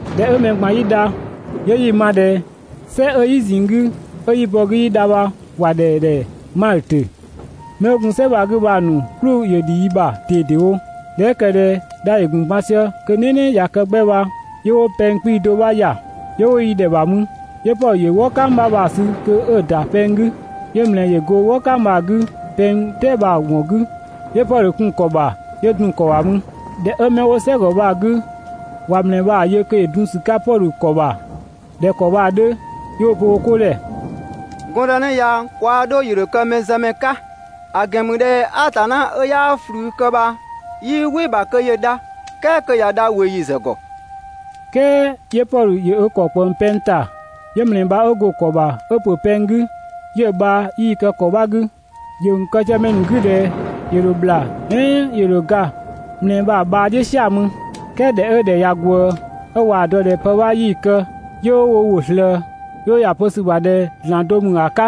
꞊Dhɛ 'ö mɛ ꞊gban 'yi dha, 'yö 'yi‑ ma ꞊dhɛ "sɛ 'ö "yi ꞊zinng 'gü 'ö 'yi bɔ‑ 'gü 'yi dha bha ‑wa ‑dhɛ ‑dhɛ Maltö. 'Mɛ 'wo gun "sɛ bha‑ 'gü bha‑ ‑nu "klʋ ‑yö ‑dhi yi ‑bha ꞊dedewo. ꞊Dhɛ 'ö ‑kë ꞊dhɛ dha ‑yö ‑gun ban sië kö "nɛnɛ ꞊ya kë 'gbɛ bha, 'yö 'wo pɛng 'kpii‑ do bha ‑ya, 'yö 'wo yi ‑dhɛ ‑bha mü. 'Yö Pɔdhö ‑yö "wɔ "kang 'bha ‑nu sü kö 'ö‑ ‑nu ‑da pɛng 'gü, 'yö ‑mlɛɛ ‑yö go "wɔ "kang bha‑ 'gü pɛng "tɛɛ bha‑ ‑wɔn 'gü, 'yö Pɔdhö kun‑ ‑kɔ ‑bha 'yö dun‑ ‑kɔ ‑bha mü. ꞊Dhɛ 'ö 'mɛ 'wo "sɛgɔ bha‑ 'gü ꞊wa ‑mlɛɛ bha‑ yö kö ‑yö dun ‑sü 'ka Pɔdhö ‑kɔ bha ‑dhɛ ‑kɔ bha‑ 'dhö 'yö 'wo‑ pö wo 'ko ‑dhɛ: «Gɔndënë ya kwaa 'dho ‑yö ‑dho kë mɛzëmɛ 'ka, ‑a ‑gɛn ‑mü ꞊dhɛ Atanna 'ö 'yaa ꞊flü kë bha 'yii "wɩ‑ ‑bha kö ‑yö dha, "kɛɛ kö ꞊ya dha ꞊weeyi ‑zë ‑gɔ.» "Kɛɛ 'yö Pɔdhö ‑yö ö ‑kɔ ꞊kpëng pɛng ‑ta, 'yö ‑mlɛɛ bha 'ö go‑ ‑kɔ ‑bha 'ö ‑pö pɛng 'gü, 'yö‑ bhaa 'yii‑ kë ‑kɔ 'bha 'gü. ‑Yö ‑gun kë sië mɛ ‑nu 'gü ꞊dhɛ ‑yö ‑dho ‑bhla "ɛɛn ‑yö ‑dho ga ‑mlɛɛ bha‑ bhaa "dhiʋ̈ "sia‑ mü. "Kɛɛ ꞊dhɛ 'ö‑ ‑dhɛ ꞊ya ꞊gwëë, 'ö ꞊waa‑ dɔ ꞊dhɛ pë 'bha 'yii‑ kë, 'yö 'wo wo ‑wʋ ꞊slëë, 'yö 'wo ‑ya pö ‑sü ‑bha ꞊dhɛ Atanna ‑mü ‑a 'ka.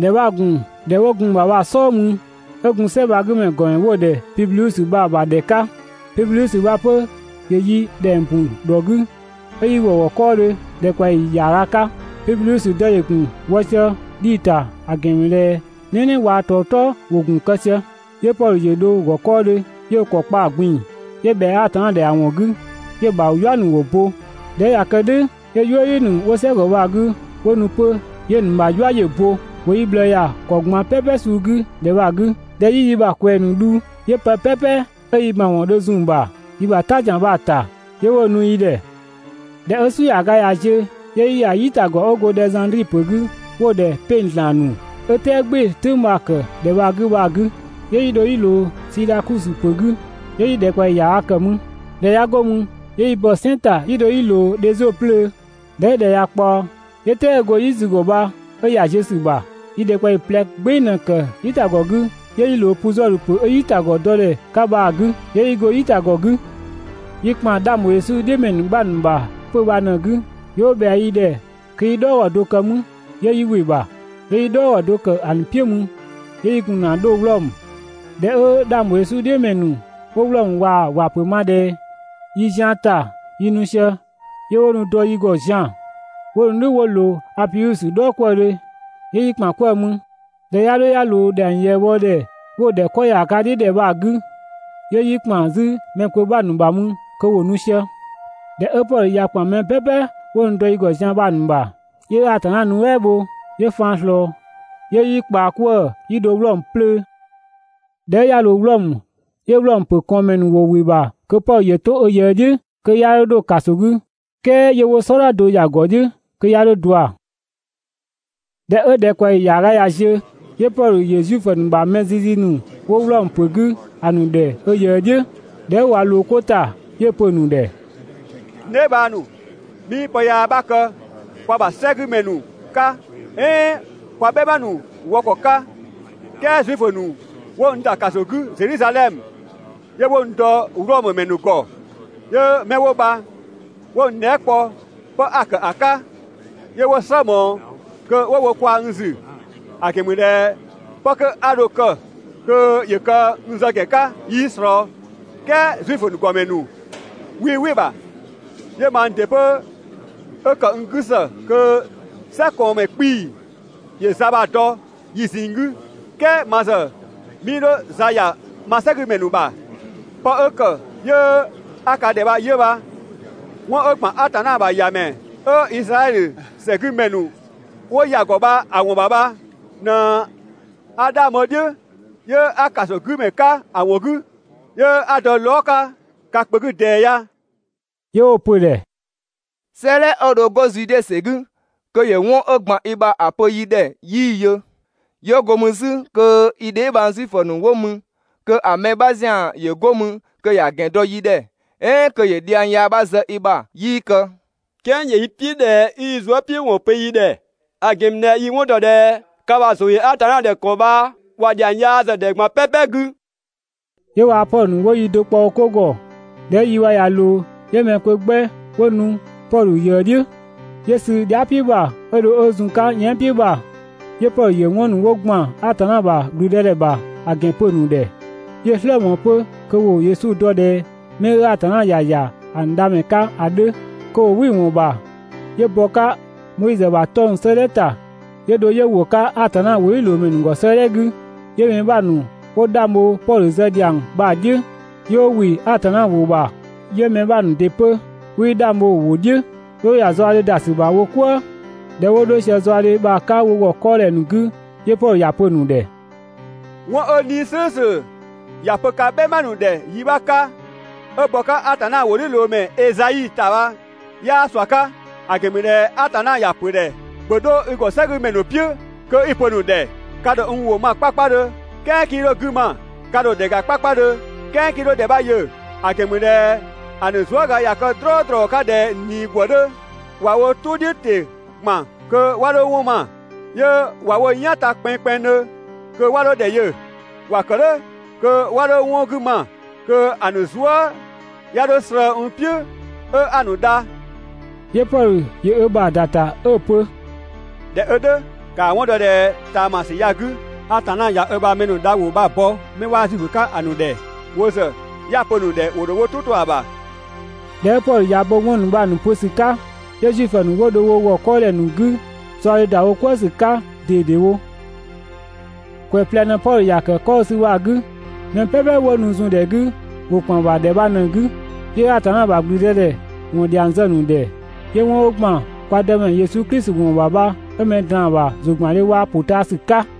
‑Dhɛ 'bha‑ ‑gun ‑dhɛ 'wo gun‑ ‑bha bha‑ "sɔɔ mü 'ö gun "sɛ bha‑ 'gü ‑mɛ ‑nu ‑gɔmɛ 'wo‑ ‑dhɛ Pibliüsö bha‑ ‑bha ‑dhɛ 'ka. Pibliüsö bha 'pö, ‑yö yi ‑dhɛng bun ‑dhɔ 'gü 'ö 'yi ‑wɔ ‑gɔ 'kɔɔdhö ‑dhɛkpaɔyi ‑yaaga 'ka. Pibliüsö dë ‑yö ‑gun wɔ sië dhii‑ ‑ta, ‑a ‑gɛn ‑mü ꞊dhɛ "nɛnɛ waa‑ ‑tɔɔtɔɔ ‑wo gun‑ kë sië, 'yö Pɔdhö ‑yö dho‑ ‑gɔ 'kɔɔdhö 'yö ö ‑kɔ kpa‑ ꞊gbin‑ 'yö ꞊bhɛa Atanna ‑dhɛ ‑a ‑wɔn 'gü, 'yö‑ ‑bha "yua ‑nu bha 'wo bo. ꞊Dhɛ 'ö ꞊ya kë "dhʋ̈, 'yö "yuëdhi ‑nu 'wo "sɛgɔ bha‑ 'gü 'wo nu 'pö, 'yö‑ ‑nu ‑bha "yua ‑yö bo. ‑Wo yi ꞊bhlëë ‑ya ‑kɔ ꞊gban "pɛpɛ suu 'gü ‑dhɛ bha‑ 'gü. ꞊Dhɛ 'yi yi ‑bha ꞊kwɛɛ‑ ‑nu dhu, 'yö pë "pɛpɛ 'ö yi ‑mawɔn dho zun‑ ‑bha yi ‑bha "ta ‑zian bha‑ ‑ta, 'yö 'wo‑ nu yi ‑dhɛ. ꞊Dhɛ 'ö "su ‑yaaga ꞊ya ziö, 'yö 'yi ‑ya "yitagɔ 'ö go Dhɛzandri ‑pö 'gü 'wo‑ ‑dhɛ «'peng‑ ‑zlan ‑nu» 'ö "tɛɛ "gbɩɩ‑ "tʋ̈ng bha‑ ‑kë ‑dhɛ bha‑ 'gü bha‑ 'gü. 'Yö 'yi dho 'yi ꞊loo Siidhakusö ‑pö 'gü, 'yö 'yi ‑dhɛkpaɔyi ‑yaaga ‑kë mü. ‑Dhɛ 'ya 'go mü, 'yö 'yi bɔ‑ "sɛn ‑ta 'yi dho 'yi ꞊loo Dhezio 'plöö. ꞊Dhɛ 'ö ‑dhɛ ꞊ya ꞊kpaɔ, 'yö "tɛɛ 'ö go "yi ‑zü ‑gɔ bha 'ö ‑ya ziö ‑sü ‑bha. Yi ‑dhɛkpaɔyi ꞊plɛ "gbeng ꞊në‑ ‑kë "yitagɔ 'gü 'yö 'yi ꞊loo Puzɔdhö ‑pö 'ö "yitagɔ dɔdhɛ 'ka bha‑ 'gü, ('yö 'yi go "yitagɔ 'gü). Yi ‑kpan 'dhang ‑bho Yesu "dhiʋ̈ ‑mɛ ‑nu 'bha ‑nu ‑bha 'pö‑ bha‑ ꞊në‑ 'gü 'yö 'wo ꞊bhɛa yi ‑dhɛ kö 'yi "dhɔɔgɔ do kë mü, ('yö 'yi ‑wɩ ‑bha). 'Yö 'yi "dhɔɔgɔ do ‑kë ‑a ‑nu "piʋ̈ mü 'yö 'yi gun ‑na 'dho Wlɔmö. ꞊Dhɛ 'ö 'dhang ‑bho Yesu "dhiʋ̈ ‑mɛ ‑nu 'wo Wlɔmö ꞊waa‑ ‑wapö ma ꞊dhɛ yi zian ‑ta yi nu sië, 'yö 'wo nu dɔ yi ‑gɔ zian‑, 'wo nu "dhʋ̈ 'wo ꞊loo Apiusö "dhɔɔkwëëdhö 'yö 'yi ‑kpan 'kwëë‑ mü. ꞊Dhɛ 'ya 'dho 'ya ꞊loo ‑dhɛng ꞊yëëbhodhɛ 'wo‑ ‑dhɛ 'kɔ ‑yaaga "dhiʋ̈ ‑dhɛ bha‑ 'gü, 'yö 'yi ‑kpan 'zü mɛ kpö 'bha ‑bha mü kö ‑wo nu sië. ꞊Dhɛ 'ö Pɔdhö ꞊ya ‑kpan mɛ "pɛpɛ 'wo nu ‑dɔ yi ‑gɔ zian bha‑ ‑nu ‑bha, 'yö Atanna nuɛ" bho, 'yö faan ꞊slɔɔ 'yö 'yi ꞊kpaa 'kwëë‑ 'yi dho Wlɔmö 'plöö. ꞊Dhɛ 'ö 'ya ‑loo Wlɔmö, 'yö Wlɔmö ‑pö ꞊kɔɔnmɛ ‑nu 'wo ‑wɩ ‑bha kö Pɔdhö ‑yö 'to ö ꞊yëë "dhiʋ̈, kö 'ya 'dho 'dho ‑kaso 'gü, "kɛɛ 'yö 'wo "sɔdha do ‑ya ‑gɔ "dhiʋ̈ kö 'ya 'dho ꞊dua. ꞊Dhɛ 'ö ‑dhɛkpaɔyi ‑yaaga ꞊ya ziö, 'yö Pɔdhö ‑yö Zuifö ‑nu ‑bha mɛ zizi ‑nu 'wo Wlɔmö ‑pö 'gü ‑a ‑nu ‑dhɛ ö ꞊yëë "dhiʋ̈. ꞊Dhɛ 'ö ꞊wa ꞊loo 'ko ‑ta, 'yö‑ pö‑ ‑nu ‑dhɛ: «N dheebhang ‑nu, 'mii pë yaa 'bha kë kwa ‑bha "sɛgümɛ ‑nu 'ka "ɛɛn kwa "bhɛma ‑nu wɔ ‑kɔ 'ka, "kɛɛ Zuifö ‑nu ‑wo n ‑kun 'wo n ‑da ‑kaso 'gü Zedhizadhɛmö, 'yö 'wo n dɔ Wlɔmö ‑mɛ ‑nu ‑gɔ. 'Yö 'mɛ 'wo bha 'wo n dhɛɛ" kpɔ 'pë 'a‑ ‑kë ‑a 'ka, 'yö 'wo‑ "slë ꞊mɔɔ kö ‑wo wo kwaa‑ n ‑zü, ‑a ‑gɛn ‑mü ꞊dhɛ 'pë 'kö 'a dho‑ kë kö ‑yö kë n zë ‑gɛn 'ka 'yii ꞊slɔɔ. "Kɛɛ Zuifö ‑nu ‑gɔmɛ ‑nu 'wii "wɩ‑ ‑bha. 'Yö mang ‑dɩ 'pö 'ö ‑kë n 'gü ‑së kö "sɛkɔɔnmɛ 'kpii‑ ‑yö za bha‑ dɔ yi ꞊zinng 'gü. "Kɛɛ ma ‑zë 'mii 'dho za ‑ya ma "sɛgümɛ ‑nu ‑bha. 'Pë 'ö ‑kë 'yö 'a ka ‑dhɛ bha 'yö bha. 'Wɔn 'ö ‑gban Atanna ‑bha ‑Yamɛ 'ö Izraɛdhö ‑sɛgümɛ ‑nu 'wo ‑ya ‑gɔ bha‑ ‑wɔn ‑bha bha ꞊në 'a ('dhang bho‑ "dhiʋ̈ 'yö 'a) ‑kasogümɛ 'ka‑ ‑wɔn 'gü, 'yö 'a ‑dɔ lɔɔga 'ka ka kpö 'gü ꞊dɛɛ ya.» 'Yö 'wo‑ pö‑ ‑dhɛ: «'Sëëdhɛ 'ö dho 'go Zude ‑sɛ 'gü kö ‑yö 'wɔn 'ö ‑gban i ‑bha ‑a pö yi ‑dhɛ 'yii‑ yö, ꞊ya 'go mü 'zü kö yi dheebhang Zuifö ‑nu 'wo mü kö ‑a mɛ 'bha ‑zian ‑yö 'go mü kö ‑ya ‑gɛn dɔ yi ‑dhɛ, "ɛɛn kö ‑yö dhiang yaa 'bha zë i ‑bha 'yii kë, "kɛɛ ‑yö yi "piʋ̈ ꞊dhɛ 'i i zuëpiʋ̈wɔn pö yi ‑dhɛ, ‑a ‑gɛn ‑mü ꞊dhɛ yi 'wɔn ‑dɔ ꞊dhɛ ka ‑bha ‑zʋ ‑yö Atanna ‑dhɛ ‑kɔ bha ‑wa ‑dhiang yaa ‑zë ‑dhɛ ꞊gban "pɛpɛ 'gü.» 'Yö waa‑ Pɔdhö ‑nu 'wo yi do kpɔ wo 'ko ‑gɔ. ꞊Dhɛ 'ö yi bha ꞊ya ꞊loo, 'yö mɛ kpö 'gbɛ 'wo nu Pɔdhö ꞊yëë "dhiʋ̈. 'Yö sü dhia" "piʋ̈ ‑bha, 'ö dho 'ö zun‑ 'ka yɛan" "piʋ̈ ‑bha, 'yö Pɔdhö ‑yö 'wɔn ‑nu 'wo ‑gban Atanna ‑bha ‑gblüdëdhɛ ‑bha ‑a ‑gɛn pö‑ ‑nu ‑dhɛ. 'Yö‑ "slë ꞊mɔɔ 'pö kö ‑wo (Yesu dɔ ꞊dhɛ 'mɛ 'ö Atanna ‑ya ‑ya ‑a ‑nu dhamɛ 'ka ‑a 'dhö, kö ‑wo) "wɩ‑ ‑wɔn ‑bha, 'yö bɔ‑ 'ka Moizö ‑bha 'tɔng‑ 'sëëdhɛ ‑ta, 'yö dho 'yö ‑wo 'ka Atanna ‑wʋdhiʋ̈loomɛ ‑nu ‑gɔ 'sëëdhɛ 'gü. 'Yö mɛ 'bha ‑nu 'wo 'dhang bho Pɔdhö zë ‑dhiang bha‑ "dhiʋ̈, 'yö 'wo ‑wɩ Atanna ‑wʋ ‑bha. 'Yö mɛ 'bha ‑nu ‑dɩ 'pö 'wii 'dhang bho‑ ‑wʋ "dhiʋ̈. 'Yö 'wo ‑ya zaɔdhe ‑da ‑sü ‑bha wo "kwëë. ꞊Dhɛ 'wo 'dho sië zaɔdhe bha‑ 'ka wo ‑gɔ 'kɔɔdhɛ ‑nu 'gü, 'yö Pɔdhö ‑ya pö‑ ‑nu ‑dhɛ: «'Wɔn 'ö 'Nii‑ "slʋ̈ʋ̈slʋ̈ ‑ya pö ka "bhɛma ‑nu ‑dhɛ yi 'bha 'ka 'ö bɔ‑ 'ka Atanna ‑wʋdhiʋ̈loomɛ Ezai ‑ta bha 'yaa ꞊sua 'ka. ‑A ‑gɛn ‑mü ꞊dhɛ Atanna ‑ya ‑pö ‑dhɛ: «‑Bhö 'dho i ‑gɔ "sɛgümɛ ‑nu "piʋ̈ kö 'i‑ pö‑ ‑nu ‑dhɛ: «Ka ‑dho n ‑wʋ ma 'kpakpadhö, "kɛɛ 'kii 'dho‑ 'gü ma, 'ka ‑dho ‑dhɛ ‑ga 'kpakpadhö, "kɛɛ 'kii 'dho ‑dhɛ 'bha yö, ‑a ‑gɛn ‑mü ꞊dhɛ ‑a ‑nu zuëga ꞊ya kë "drɔɔdrɔ 'ka ꞊dhɛ ꞊nii ‑gwë 'dhö. ꞊Wa wo "tʋ "dhiʋ̈ ‑te ‑gban kö 'wa 'dho 'wɔn ma, 'yö ꞊wa wo "yan ta kpɛnngkpɛnngdhö kö 'wa 'dho ‑dhɛ yö, ‑wa ‑kë "dhʋ̈ kö 'wa 'dho 'wɔn 'gü ma kö ‑a ‑nu zuë" 'ya 'dho slëë‑ n "piʋ̈ 'ö 'a‑ ‑nu dha.» 'Yö Pɔdhö ‑yö ö ‑bha ‑da ‑ta 'ö‑ pö: «꞊Dhɛ 'ö "dhʋ̈, ‑kaa 'wɔn dɔ ꞊dhɛ ꞊taamasü ya‑ 'gü Atanna ꞊ya ö ‑bha mɛ dha ‑wʋ bha‑ bɔ 'mɛ 'waa Zuifö 'ka‑ ‑nu ‑dhɛ. Wo ‑zë ('ya‑ pö‑ ‑nu ‑dhɛ) ‑wo ‑dho wo "tʋ 'to‑ ‑bha.» [꞊Dhɛ 'ö Pɔdhö ꞊ya bo 'wɔn ‑nu bha‑ ‑nu pö ‑sü 'ka, 'yö Zuifö ‑nu 'wo dho wo ‑gɔ 'kɔɔdhɛ ‑nu 'gü, zaɔdhe ‑da wo "kwëë ‑sü 'ka ꞊dedewo.] ‑Kwɛ ꞊plɛ ꞊në‑ Pɔdhö ‑ya kë 'kɔ 'ö‑ sü bha‑ 'gü. Mɛ "pɛpɛ 'wo nu zun‑ ‑dhɛ 'gü ‑wo ‑kpan ‑bha ‑dhɛ bha ꞊në‑ 'gü. 'Yö Atanna ‑bha ‑gblüdëdhɛ ‑wɔn ‑dhiang zë‑ ‑nu ‑dhɛ, 'yö 'wɔn 'ö ‑gban kwa Dëmɛ Yesu Klisi ‑wɔn ‑bha bha 'ö mɛ ꞊draan‑ ‑bha ‑zʋgbandhe waa‑ ‑pʋtaasü 'ka.